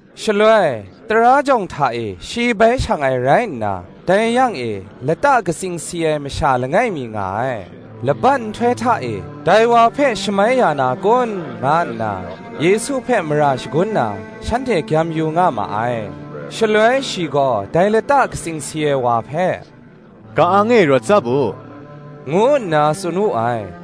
Shaloi, tara jawng hta e shi bai shang ai rai nna, dai yang e, lata katsing si ai masha langai mi nga ai. Laban nhtoi hta e, dai wa hpe shamai ya na kun? nga nna, Yesu hpe mara shagun na, shanhte gyam yu nga ma ai. Shaloi shi gaw dai lata katsing si ai wa hpe, “Ka-ang e rawt tsap u,” ngu nna tsun wu ai.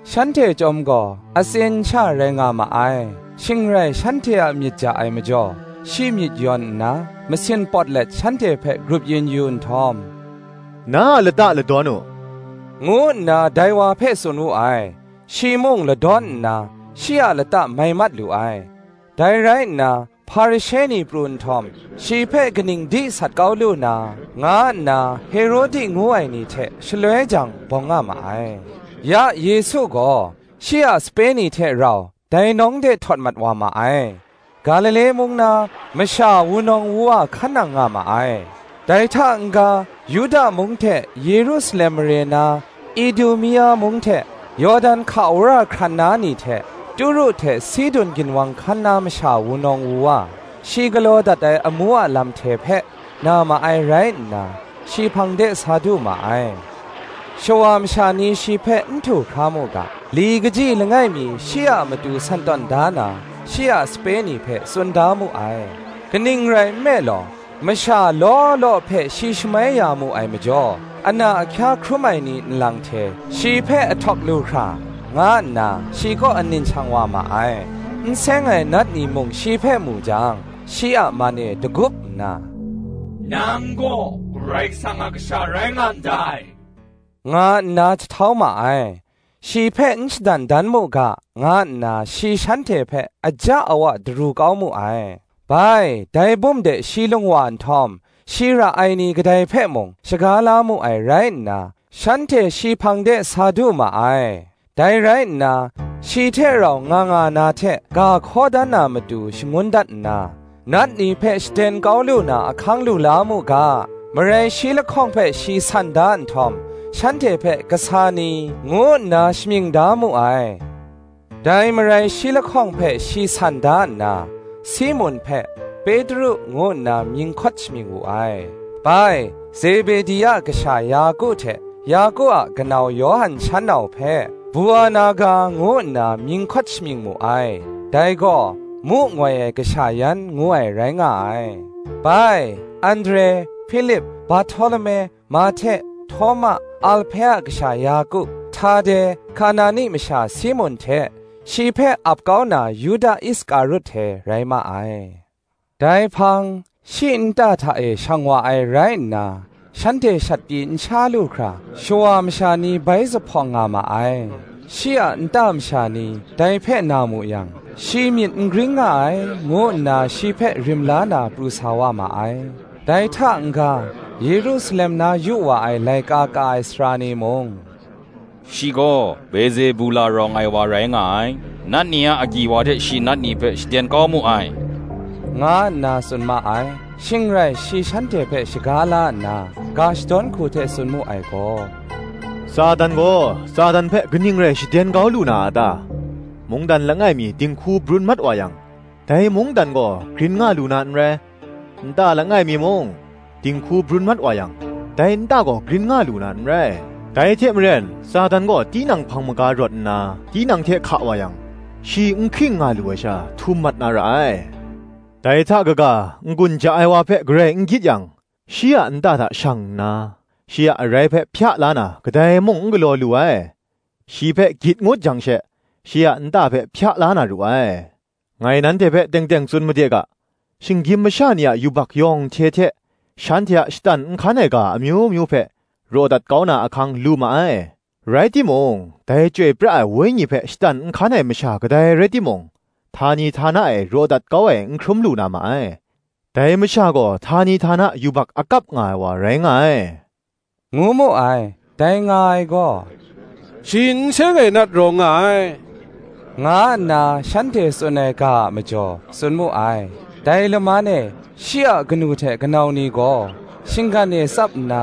Shanhte chyawm gaw, atsin sha rai nga ma ai. Shing rai shanhte a myit ja ai majaw, shi myit yawn nna, masin pawt let shanhte hpe grup yin yu nhtawm, “Na a lata ladawn u,” ngu nna dai wa hpe tsun wu ai. Shi mung ladawn nna, shi a lata mai mat lu ai. Dai rai nna, Hparishe ni pru nhtawm, shi hpe kaning di sat kau lu na, nga nna Herodi ngu ai ni hte, shaloi jang, bawng nga ma ai. Ya Yesu gaw, shi a sape ni hte rau dai nawng de htawt mat wa ma ai: Galile mung na, masha wunawng wuwa hkan nang nga ma ai; dai hta n-ga Yuda mung hte Yerusalem mare na, Idumia mung hte, Yawdan hka wora hkran na ni hte, Turu hte Sidun ginwang hkan na masha wunawng wuwa, shi galaw dat ai amu a lam hte hpe, na ma ai rai nna, shi hpang de sa du ma ai. Shawa masha ni shi hpe n ahtu hkra mu ga, li kaji langai mi shi a matu san tawn da na, shi a sape ni hpe tsun da mu ai: kaning rai nme law, masha law law hpe shi shamai ya mu ai majaw, ana ahkya hkrum ai ni nlang hte, shi hpe ahtawk lu hkra, nga nna shi kaw anin shang wa ma ai. N seng ai nat ni mung shi hpe mu jang, shi a man e dagup nna, “Nang gaw Karai Kasang a Kasha rai nga ndai,” nga nna jahtau ma ai. Shi hpe n shadan dan mu ga, nga nna shi shanhte hpe aja awa daru kau mu ai. Bai, dai bum de shi lung wa nhtawm, shi ra ai ni kadai hpe mung shaga la mu ai rai nna, shanhte shi hpang de sa du ma ai. Dai rai nna, shi hte rau nga nga na hte ga hkaw dan na matu shangun dat nna, nat ni hpe shaden kau lu na ahkang lu la mu ga, marai shi lahkawng hpe shi san da nhtawm shanhte hpe kasa ni, ngu nna shamying da mu ai. Dai marai shi lahkawng hpe shi san da nna, Simun hpe, Petru ngu nna mying hkawt shamying wu ai; bai, Zebedi a kasha Yaku hte, Yaku a kanau Yawhan shan nau hpe, Buanerga, ngu nna mying hkawt shamying mu ai; dai gaw, mu ngoi ai kasha yan ngu ai rai nga ai: bai, Andre, Hpilip, Barhtolume, Mahte, Htawma, Alhpe a kasha Yaku, Htade, Kanani masha Simun hte, shi hpe ap kau na Yuda Iskarut hte rai ma ai. Dai hpang, shi nta hta e shang wa ai rai nna, shanhte shat pyi n sha lu hkra, shawa masha ni bai zuphpawng nga ma ai. Shi a nta masha ni dai hpe na mu yang, “Shi myit n gring nga ai,” ngu nna shi hpe rim la na pru sa wa ma ai. Dai hta n-ga, Yerusalem na yu wa ai laika ka ai sara ni mung, “Shi gaw Bezebula rawng ai wa rai nga ai; nat ni a agyi wa hte shi nat ni hpe shaden kau mu ai,” nga nna tsun ma ai. Shing rai shi shanhte hpe shaga la nna, ga shadawn hku hte tsun mu ai gaw, “Satan gaw, Satan hpe kaning rai shaden kau lu na a ta? Mungdan langai mi dinghku brun mat wa yang, dai mungdan gaw grin nga lu na n rai; nta langai mi mung, dinghku brun mat wa yang, dai nta gaw grin nga lu na n rai. Dai hte maren, Satan gaw tinang hpang maga rawt nna, tinang hte hka wa yang, shi n hking nga lu ai sha, htum mat na ra ai. Dai hta kaga n-gun ja ai wa hpe garai n gyit yang, shi a nta hta shang nna, shi a arai hpe hpya la na, kadai mung n galaw lu ai; shi hpe gyit ngut jang she, shi a nta hpe hpya la na ru ai. Ngai nanhte hpe teng teng tsun made ga, Shinggyim masha ni a yubak yawng hte hte, shanhte a shatan nhkan ai ga amyu myu hpe, raw dat kau na ahkang lu ma ai: rai timung, dai Chyoi pra ai Wenyi hpe shatan nhkan ai masha kadai rai timung, htani htana e raw dat kau ai n hkrum lu na ma ai: dai masha gaw htani htana yubak akap nga ai wa rai nga ai,” ngu mu ai. Dai nga ai gaw, “Shi n seng ai nat rawng nga ai,” nga nna shanhte tsun ai ga a majaw, tsun mu ai. Dai laman e, shi a kanu hte kanau ni gaw, shinggan e tsap nna,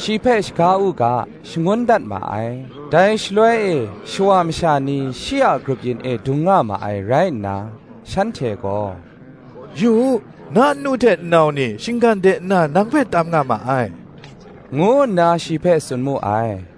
shi hpe shaga u ga, shangun dat ma ai. Dai shaloi e shawa masha ni shi a grup yin e dung nga ma ai rai nna, shanhte gaw, “Yu u, na nnu hte nnau ni, shinggan de nna nang hpe tam nga ma ai,” ngu nna shi hpe tsun mu ai.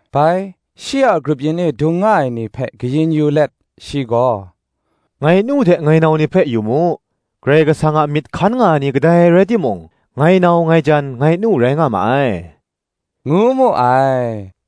Bai, shi a grup yin e dung nga ai ni hpe kayin yu let, shi gaw, “Ngai nu hte ngai nau ni hpe yu mu. Karai Kasang a myit hkan nga ai ni, kadai rai timung, ngai nau, ngai jan, ngai nu, rai nga ma ai,” ngu mu ai.